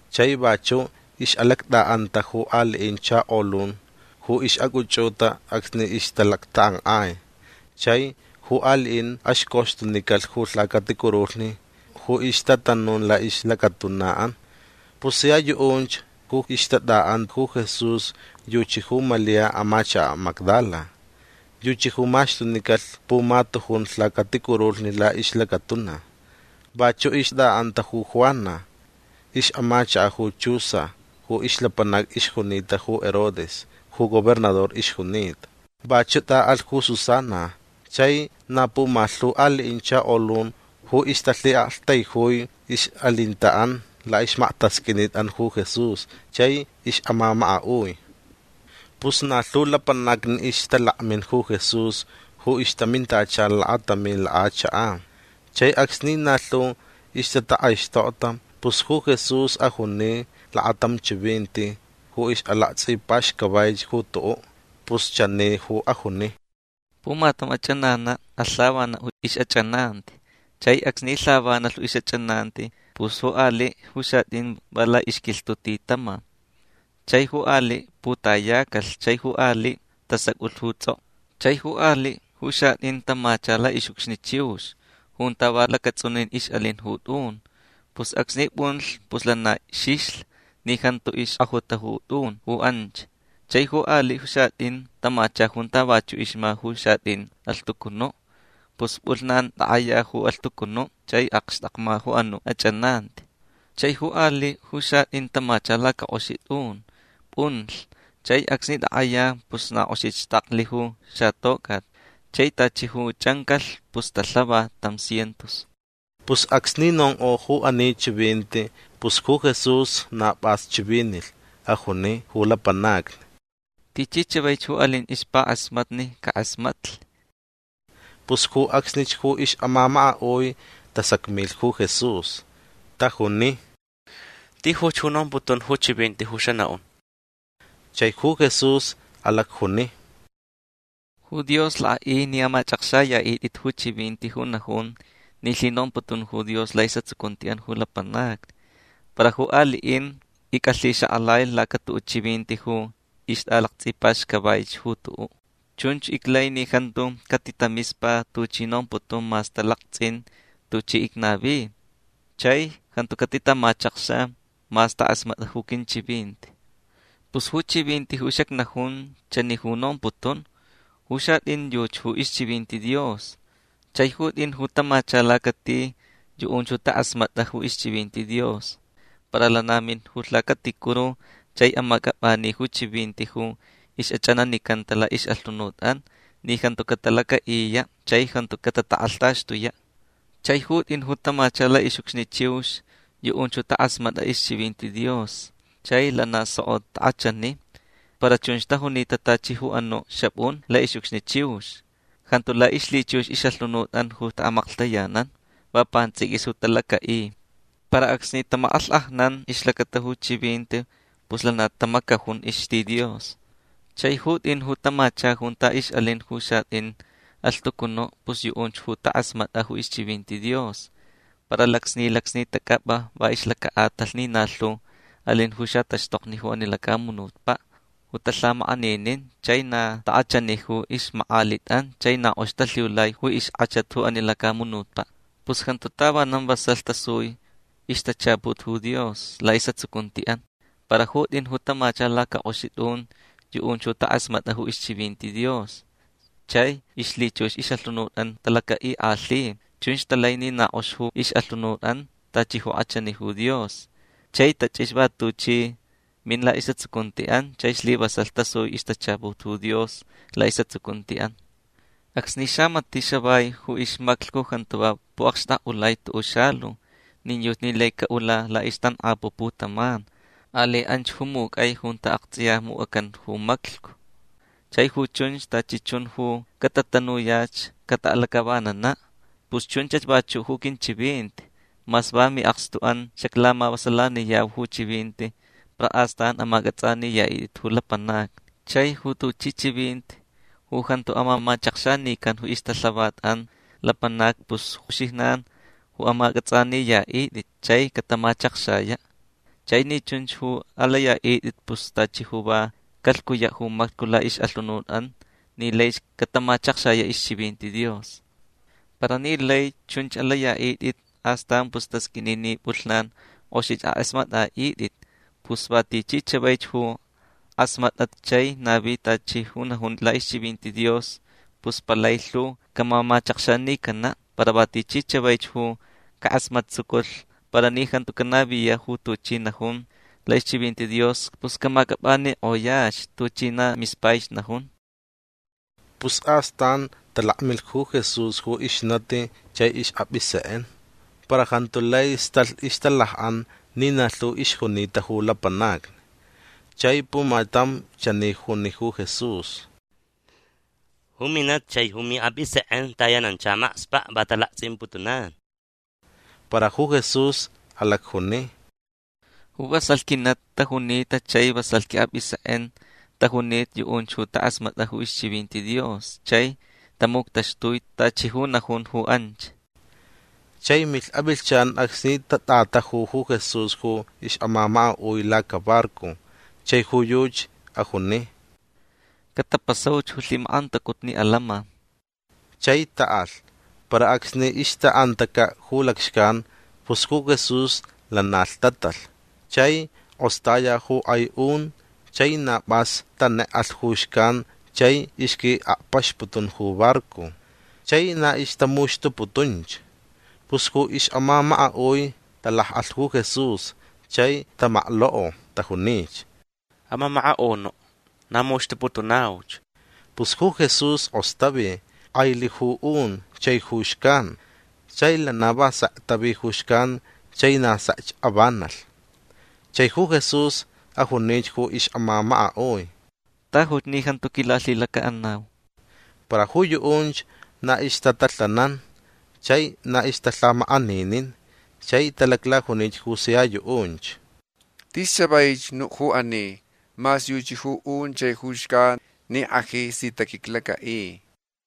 Chai vachu' ix'alact'a'anta ju ali'in chakolun ju ix'ac'uch'uta acsni ixtalactak'ank'ai chai ju ali'in axcoxtunicalh ju lhacaticurulhni ju ixtatanun la'ixlacatuna'an. Pus sia yu'unch ju ixtat'a'an ju Jesús yuchi ju Malia amachaka' Magdala. Yuchi ju maxtunicalh pumatujun lhacaticurulhni la'ixlacatuna. Vachu' ixt'a'anta ju Juana ix'amachaka' ju Chuza ju ixlapanac ixjunita ju Herodes ju gobernador ixjunita. Vachu' t'a'alh ju Susana chai na pumalhu ali'in chakolun ju ixtalhi'aktaijui ix'alinta'an la'ixmaktasq'uinit'an ju Jesús chai ix'amamaka'ui. Pus na lhu lapanacni ixtalakmin ju Jesús ju ixtamintacha lakatamin lak'achak'an. Chai acsni na lhu ixtatak'aixtokta pus ju Jesús ajuni lakatam chivinti ju ix'alakts'ipaxcavaich ju tu'u'. Pus chani ju ajuni: ―Pumatam ach'anana' alh lhavana' ju ix'ach'ananti. Chai acsni lhavanalh ju ix'ach'ananti pus ju ali' ju xat'in va la'ixquilhtu' ti tama. Chai ju ali' putayacalh chai ju ali' tasac'ulh ju ts'ok'o. Chai ju ali' ju xat'in tamacha la'ix'ucxni chiux junta va lacats'unin ix'alin ju t'un. Pus acsni p'unlh pus lana xixlh ni jantu ixk'ajuta ju t'un ju anch. Chai ju ali' ju xat'in tamacha junta vachu' ixma ju xat'in alhtucunu'. Pus p'ulhnan tak'aya ju alhtucunu' chai akxtakma ju anu' ach'ananti. Chai ju ali' ju xat'in tamacha lacak'oxi t'un. P'unlh. Chai acsni tak'aya pus na k'oxich xtaklh ju xatoc'at. Chai tachi ju ch'ancalh pus talhava tam cientos. Pus acsni nonk'o ju ani chivinti pus ju Jesús na p'as chivinilh. Ajuni ju lapanacni: ―Tichi chavaich ju alin ixpak'asmatni cak'asmatlh. Pus ju acsnich ju ix'amamaka'ui tasacmilh ju Jesús. Tajuni: ―Tijuch ju nomputun ju chivinti ju xana'un. Chai ju Jesús alacjuni: ―Ju Dios lak'a'i ni amach'akxaya'it'it ju chivinti ju najun ni lhinomputun ju Dios la'is'atsucunti'an ju lapanacni. Para ju ali'in ic'alhixak'alai lacatu'u' chivinti ju ixt'alakts'ipaxcavaich ju tu'u'. Chunch iclai ni jantu catitamispa tuchi nomputun mas talakts'in tuchi icnavi. Chai jantu catitamachakxa mas tak'asmat'a ju quinchivinti. Pus ju chivinti ju xacnajun chani ju nomputun. Ju xat'in yuchi ju ixchivinti Dios. Chai ju t'in ju tamacha lacati yu'unch ju tak'asmat'a ju ixchivinti Dios para lana min ju lhacaticuru chai amac'ap'ani ju chivinti ju ix'ach'ananicanta la'ix'alhunut'an ni jantu catalaca'iya' chai jantu catatak'alhtaxtuya'. Chai ju t'in ju tamacha la'ix'ucxni chiux yu'unch ju tak'asmat'a ixchivinti Dios chai lana soko tak'achani. Para chunch tajunita tachi ju anu' xap'un la'ix'ucxni chiux. Jantu la'ixlhichux ix'alhunut'an ju ta'amaklhtayanan. Va pants'iquis ju talaca'i. Para acsni tamak'alhk'ajnan ixlacata ju chivinti pus lana tamacajun ixti Dios. Chai ju t'in ju tamacha junta ix'alin ju xat'in alhtucunu' pus yu'unch ju tak'asmat'a ju ixchivinti Dios. Para lacsni lacsni tac'ap'a va ixlaca'atalh ni na lhu alin ju xataxtokni ju ani lacamunutpa' ju talhamak'aninin. Chai na tak'achani ju ixmak'alit'an chai na k'ox talhiulai ju ixk'achat ju ani lacamunutpa'. Pus jantu tavanan vasalh tasui ixtachaput ju Dios la'is'atsucunti'an. Para ju t'in ju tamacha lacak'oxi t'un yu'unch ju tak'asmat'a ju ixchivinti Dios chai ixlhichux ix'alhunut'an talaca'ik'alhi. Chunch talai ni na k'ox ju ix'alhunut'an tachi ju k'achani ju Dios. Chai tach'ixa va tuchi min la'is'atsucunti'an chai slivasalh tasui ixtachaput ju Dios la'is'atsucunti'an. Acsni xamati' xavai ju ixmaclhcu jantu va pu'akxtak'ulai tu'u' xalu. Nin yuchi ni lai ca'ula la'ixtank'apu' putaman. Alai anch ju muc'ai junta akts'iya muc'acan ju maclhcu. Chai ju chunch tachi chun ju catatanuyach cata'alac'avanana'. Pus chunchach vachu' ju quinchivinti. Mas va mi'akstu'an xaclamavasalaniyau ju chivinti para astan amac'ats'aniya'it'it ju lapanacni. Chai ju tuchi chivinti ju jantu amamachakxanican ju ixtalhavat'an lapanacni pus uxijnan ju amac'ats'aniya'it'it chai catamachakxaya'. Chai ni chunch ju alaya'it'it pus tachi ju va calhcuya' ju maclhcu la'ix'alhunut'an ni laich catamachakxaya' ixchivinti Dios. Para ni lai chunch ju alaya'it'it astan pus tasq'uini ni p'ulhnan k'oxich ak'asmat'a'it'it. Pus va tichi chavaich ju k'asmat'a chai navi tachi ju najun la'ixchivinti Dios pus palai lhu camamachakxanicana'. Para va tichi chavaich ju cak'asmattsuculh para ni jantu canaviya' ju tuchi najun la'ixchivinti Dios pus camac'ap'anik'oyach tuchi na mispaich najun. Pus astan talakmilh ju Jesús ju ixnati chai ix'ap'isek'en. Para jantu lai stalh ixtalak'an ni na lhu ixjunita ju lapanacni. Chai pumatam chani juni ju Jesús: ―Ju minati chai ju mi'ap'isek'en tayanancha makspa'. Va talakts'imputunan. Para ju Jesús alacjuni: ―Ju vasalh quinati tajunita chai vasalh qui'ap'isek'en tajunita yu'unch ju tak'asmat'a ju ixchivinti Dios chai tamuctaxtui tachi ju najun ju anch. Chai milh avilhchan acsni tat'ataju ju Jesús ju ix'amamaka'ui lacabarco. Chai ju yuchi ajuni: ―Catapasauch ju lhimak'antacutni atants'in. Chai ta'alh. Para acsni ixta'antaca' ju lacxcan pus ju Jesús lana lhtatalh. Chai k'ostaya ju k'ai un chai na p'as tanek'alh ju xcan chai ixqui'akpaxputun ju barco. Chai na ixtamuxtuputunch. Pus ju ix'amamaka'ui talak'alh ju Jesús chai tamaklok'o. Tajunich: ―Amamaka'unu' na muxtuputunauch. Pus ju Jesús k'ostavi. K'ailh ju un chai ju xcan. Chai lana va sek tavi ju xcan chai na sekch avanalh. Chai ju Jesús ajunich ju ix'amamaka'ui: ―Tajuch ni jantu quilalhilaca'anau. Para ju yu'unch na ixtatalhanan chai na ixtalhamak'aninin. Chai talaclajunich ju sia yu'unch: ―Tis chavaich nu' ju ani. Mas yuchi ju un chai ju xcan ni ak'aji si taquiclaca'i.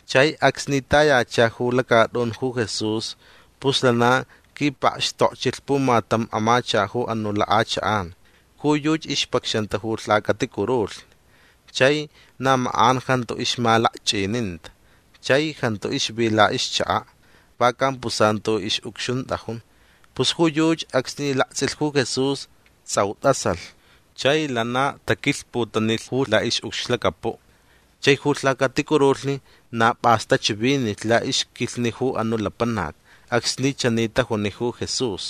Chai acsni tayacha ju lacat'un ju Jesús pus lana quipakxtokchilh pumatam amachaka' ju anu' lak'achak'an. Ju yuchi ixpacxanta ju lhacaticurulhni. Chai na mak'an jantu ixmalakch'ininta. Chai jantu ixvi la'ixchaka'. Va campusantu ix'ucxunt'ajun. Pus ju yuchi acsni lakts'ilh ju Jesús ts'au t'asalh. Chai lana taquilhputanilh ju la'ix'ucxlacapu'. Chai ju lhacaticurulhni na p'as tachivinilh la'ixquilhni ju anu' lapanac acsni chani tajuni ju Jesús: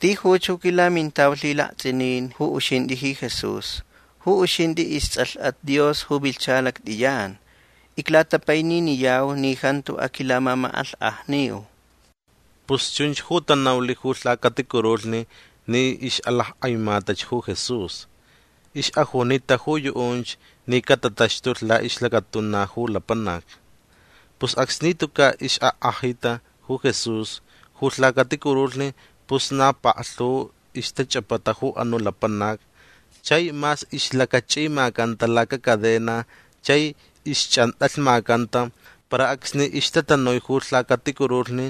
―Tijuch ju quilamintau lhilakts'inin ju uxint'i ji Jesús. Ju uxint'i ists'alh'at Dios ju vilhcha lact'iyan. Iclatapaininiyau ni jantu aquilamamak'alhk'ajniu. Pus chunch ju tanaulh ju lhacaticurulhni ni ix'alack'aimatach ju Jesús. Ix'ajunita ju yu'unch ni catataxtulh la'ixlacatuna ju lapanac. Pus acsni tuca' ix'ak'ajita ju Jesús ju lhacaticurulhni pus na paklhu ixtach'apata ju anu' lapanac. Chai mas ixlacach'imacanta lacacadena chai ixch'ant'alhmacanta para acsni ixtatanui ju lhacaticurulhni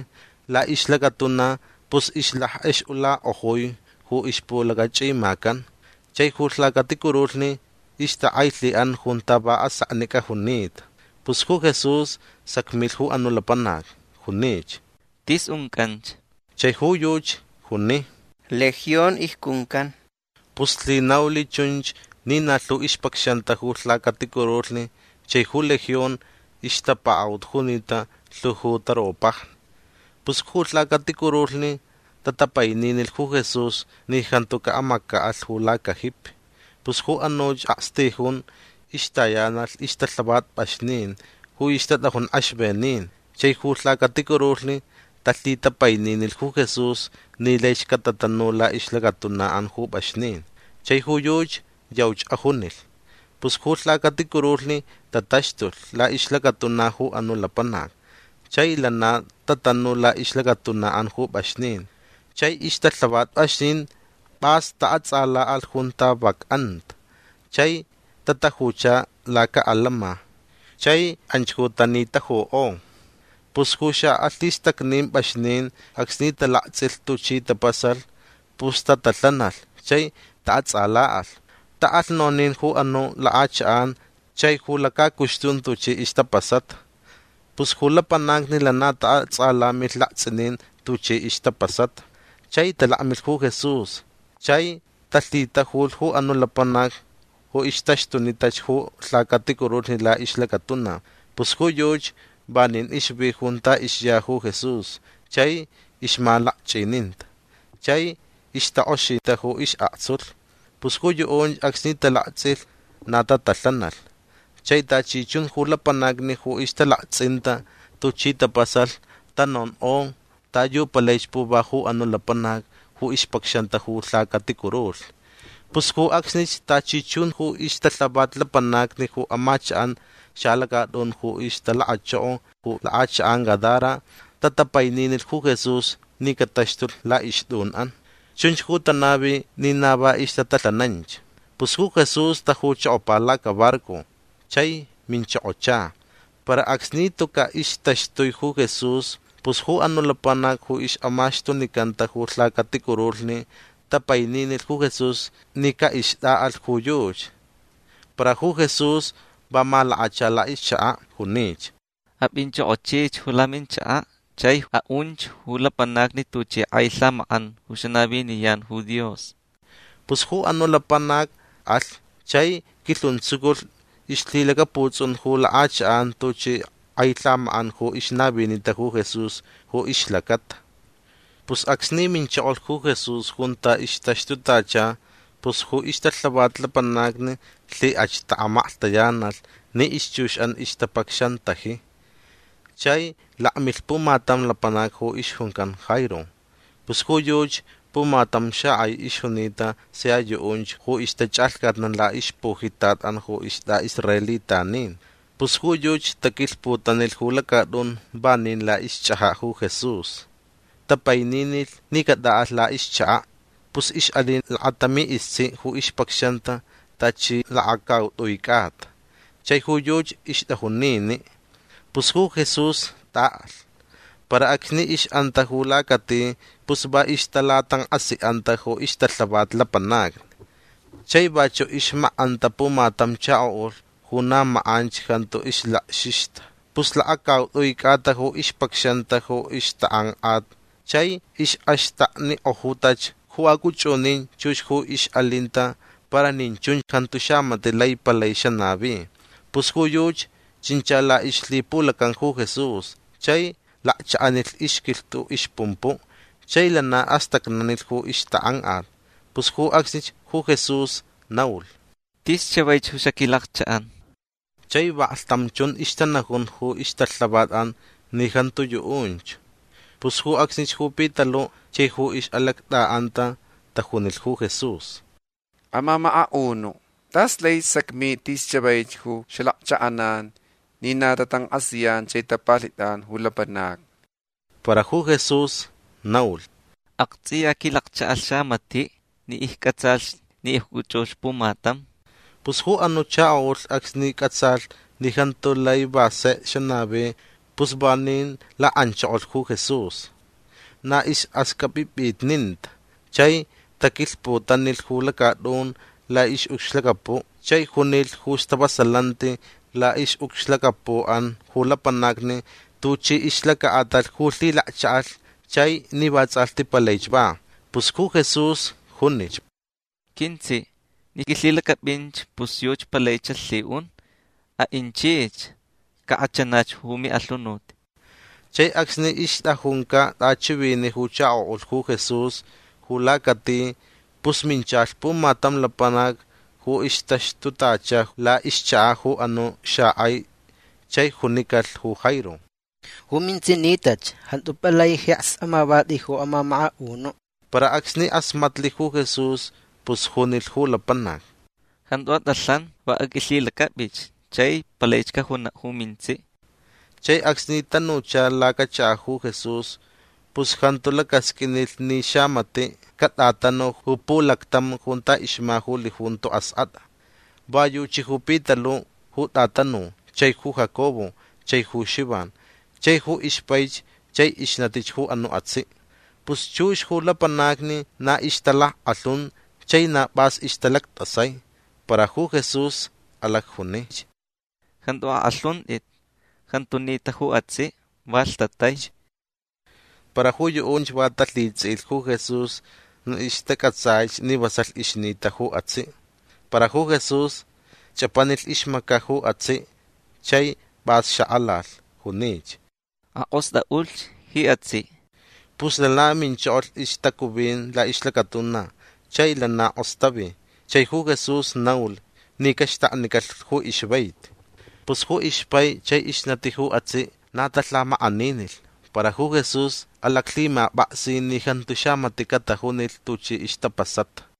la'ixlacatuna pus ixlack'ex'ulak'ojui ju ixpulacach'imacan. Chai ju lhacaticurulhni ixtak'ailhi'an junta va aseknic'a junita. Pus ju Jesús sacmilh ju anu' lapanac. Junich: ―T'is unc'anch. Chai ju yuchi juni: ―Legión icjuncan. Pus lhinaulh chunch ni na lhu ixpacxanta ju lhacaticurulhni chai ju Legión ixtapaka'ut junita lhu ju taropajni. Pus ju lhacaticurulhni tatapaininilh ju Jesús ni jantu ca'amaca'alh ju lacajipi. Pus ju anuch akstijun ixtayanalh ixtalhavat p'axnin ju ixtat'ajun k'exvenin. Chai ju lhacaticurulhni talhitapaininilh ju Jesús ni laich catatanu la'ixlacatuna'an ju p'axnin. Chai ju yuchi yauch ajunilh. Pus ju lhacaticurulhni tataxtulh la'ixlacatuna ju anu' lapanac chai lana tatanu la'ixlacatuna'an ju p'axnin. Chai ixtalhavat p'axnin p'as ta'ats'ala'alh junta vak anta. Chai tatajucha laca'atants'in. Chai anch ju tanitajuk'o. Pus ju xa'alhistacnin p'axnin acsni talakts'ilh tuchi tapasalh pus tatalhanalh chai ta'ats'ala'alh. Ta'alh nonin ju anu' lak'achak'an chai ju lacacuxtun tuchi ixtapasata. Pus ju lapanacni lana ta'ats'alamilh lakts'inin tuchi ixtapasata. Chai talakmilh ju Jesús chai talhitajulh ju anu' lapanac ju ixtaxtunitach ju lhacaticurulhni la'ixlacatuna. Pus ju yuchi vanin ixvi junta ixya ju Jesús chai ixmalakch'ininta chai ixtak'oxita ju is'aktsulh. Pus ju yu'unch acsni talakts'ilh na tatalhanalh. Chai tachi chun ju lapanacni ju ixtalakts'inta tuchi tapasalh tanonk'o ta yu palaich puva ju anu' lapanac ju ixpacxanta ju lhacaticurulhni. Pus ju acsnich tachi chun ju ixtalhavat lapanacni ju amachak'an xalacat'un ju ixtalakachoko ju lak'achak'an Gadara tatapaininilh ju Jesús ni cataxtulh la'ixt'un'an. Chunch ju tanavi ni na va ixtatalhananch. Pus ju Jesús tajuchokopa lacabarco. Chai minchokocha. Para acsni tuca' ixtaxtui ju Jesús pus ju anu' lapanac ju ix'amaxtunicanta ju lhacaticurulhni tapaininilh ju Jesús ni ca'ixt'a'alh ju yuchi. Para ju Jesús va malakacha la'ixchaka'. Junich: ―Ap'inch'ok'ochich ju laminchaka' chai a'unch ju lapanacni tuchi k'ai lhamak'an ju xanaviniyan ju Dios. Pus ju anu' lapanac alh chai quilhuntsuculh ixlhilacaputs'un ju lak'achak'an tuchi k'ai lhamak'an ju ixnavinita ju Jesús ju ixlacata. Pus acsni minchokolh ju Jesús junta ixtaxtutacha pus ju ixtalhavat lapanacni lhik'ach ta'amaklhtayanalh ni ixchux'an ixtapacxantaji. Chai lakmilh pumatam lapanac ju ixjuncan Jairo. Pus ju yuchi pumatam xak'ai ixjunita sia yu'unch ju ixtach'alhcatnan la'ixpujitat'an ju ist'a'israelitanin. Pus ju yuchi taquilhputanilh ju lacat'un vanin la'ixch'aja' ju Jesús. Tapaininilh ni cat'a'alh la'ixchaka'. Pus ix'alin lakatami istsi' ju ixpacxanta tachi lakacaut'ui c'ata. Chai ju yuchi ixt'ajun nini'. Pus ju Jesús t'a'alh. Para acsni ix'anta ju lacati pus va ixtalatank'asi'anta ju ixtalhavat lapanacni. Chai vachu' ixmak'anta pumatam chako'ulh ju na mak'anch jantu ixlakxixta. Pus lakacaut'ui c'ata ju ixpacxanta ju ixtak'ank'at chai ix'axtaknik'ojutach ju ac'uch'unin chux ju ix'alinta para nin chun jantu xamati' lai palai xanavi. Pus ju yuchi chincha la'ixlhipulacan ju Jesús chai lakcha'anilh ixquilhtu' ixpumpu'. Chai lana astacnanilh ju ixtak'ank'at. Pus ju acsnich ju Jesús naulh: ―Tis chavaich ju xaquilakcha'an. Chai vaklhtam chun ixtanajun ju ixtalhavat'an ni jantu yu'unch. Pus ju acsnich ju Pitalu' chai ju ix'alact'a'anta tajunilh ju Jesús: ―Amamaka'unu' t'as laich sacmit'i tis chavaich ju xalakcha'anan ni na tatank'asiyan chai tapalhit'anch ju lapanacni. Para ju Jesús naulh: ―Akts'iya quilakcha'alh xamati' ni icc'atsalh ni icc'uch'ulh pumatam. Pus ju anu' chako'ulh acsni c'atsalh ni jantu lai va sek xanavi pus vanin lak'anchokolh ju Jesús. Na ix'axq'uip'ip'itninta. Chai taquilhputanilh ju lacat'un la'ix'ucxlacapu' chai junilh ju stavasalanti la'ix'ucxlacapu'an ju lapanacni tuchi ixlaca'atalh ju lhilakcha'alh chai ni vats'alhti palaich va. Pus ju Jesús junich: ―Quintsi' ni q'uilhilac'ap'inch pus yuchi palaich xalhi'un. A'inchich. Cak'achanach ju mi'alhunut. Chai acsni ixt'ajunca' t'achivini' ju chako'ulh ju Jesús ju lacati pus minchalh pumatam lapanac ju ixtaxtutacha la'ixchaka' ju anu' xak'ai chai junicalh ju Jairo: ―Ju mintsi' nitach. Jantu palai jeks amavat'i ju amamaka'unu'. Para acsni k'asmatlh ju Jesús pus junilh ju lapanac: ―Jantu at'alhan. Va aq'uilhilac'ap'ich. Chai palaich cajuna' ju mintsi'. Chai acsni tanucha lacachaka' ju Jesús pus jantu lacasq'uinilh ni xamati' cat'atanu ju pulactam junta ixma ju lijunto ask'at'a. Va yuchi ju Pitalu' ju t'atanu chai ju Jacobo chai ju Xivan chai ju ixpaich chai ixnatich ju anu' atsi'. Pus chux ju lapanacni na ixtalack'alhun chai na p'as ixtalact'asai. Para ju Jesús alacjunich: ―Jantu ak'alhunt'it. Jantu nita ju atsi'. Va lhtataich. Para ju yu'unch va talhits'i'ilh ju Jesús ni ixtac'atsaich ni vasalh ixnita ju atsi'. Para ju Jesús ch'apanilh ixmaca' ju atsi' chai p'as xak'alalh. Junich: ―Ak'ost'a'ulhch ji atsi'. Pus lana minchokolh ixtacuvin la'ixlacatuna chai lana k'ostavi. Chai ju Jesús naulh ni caxtaknicalh ju ixvaiti. Pus ju ixpai chai ixnati ju atsi' na talhamak'aninilh. Para ju Jesús alaclhimap'aksi ni jantu xamati' catajunilh tuchi ixtapasata.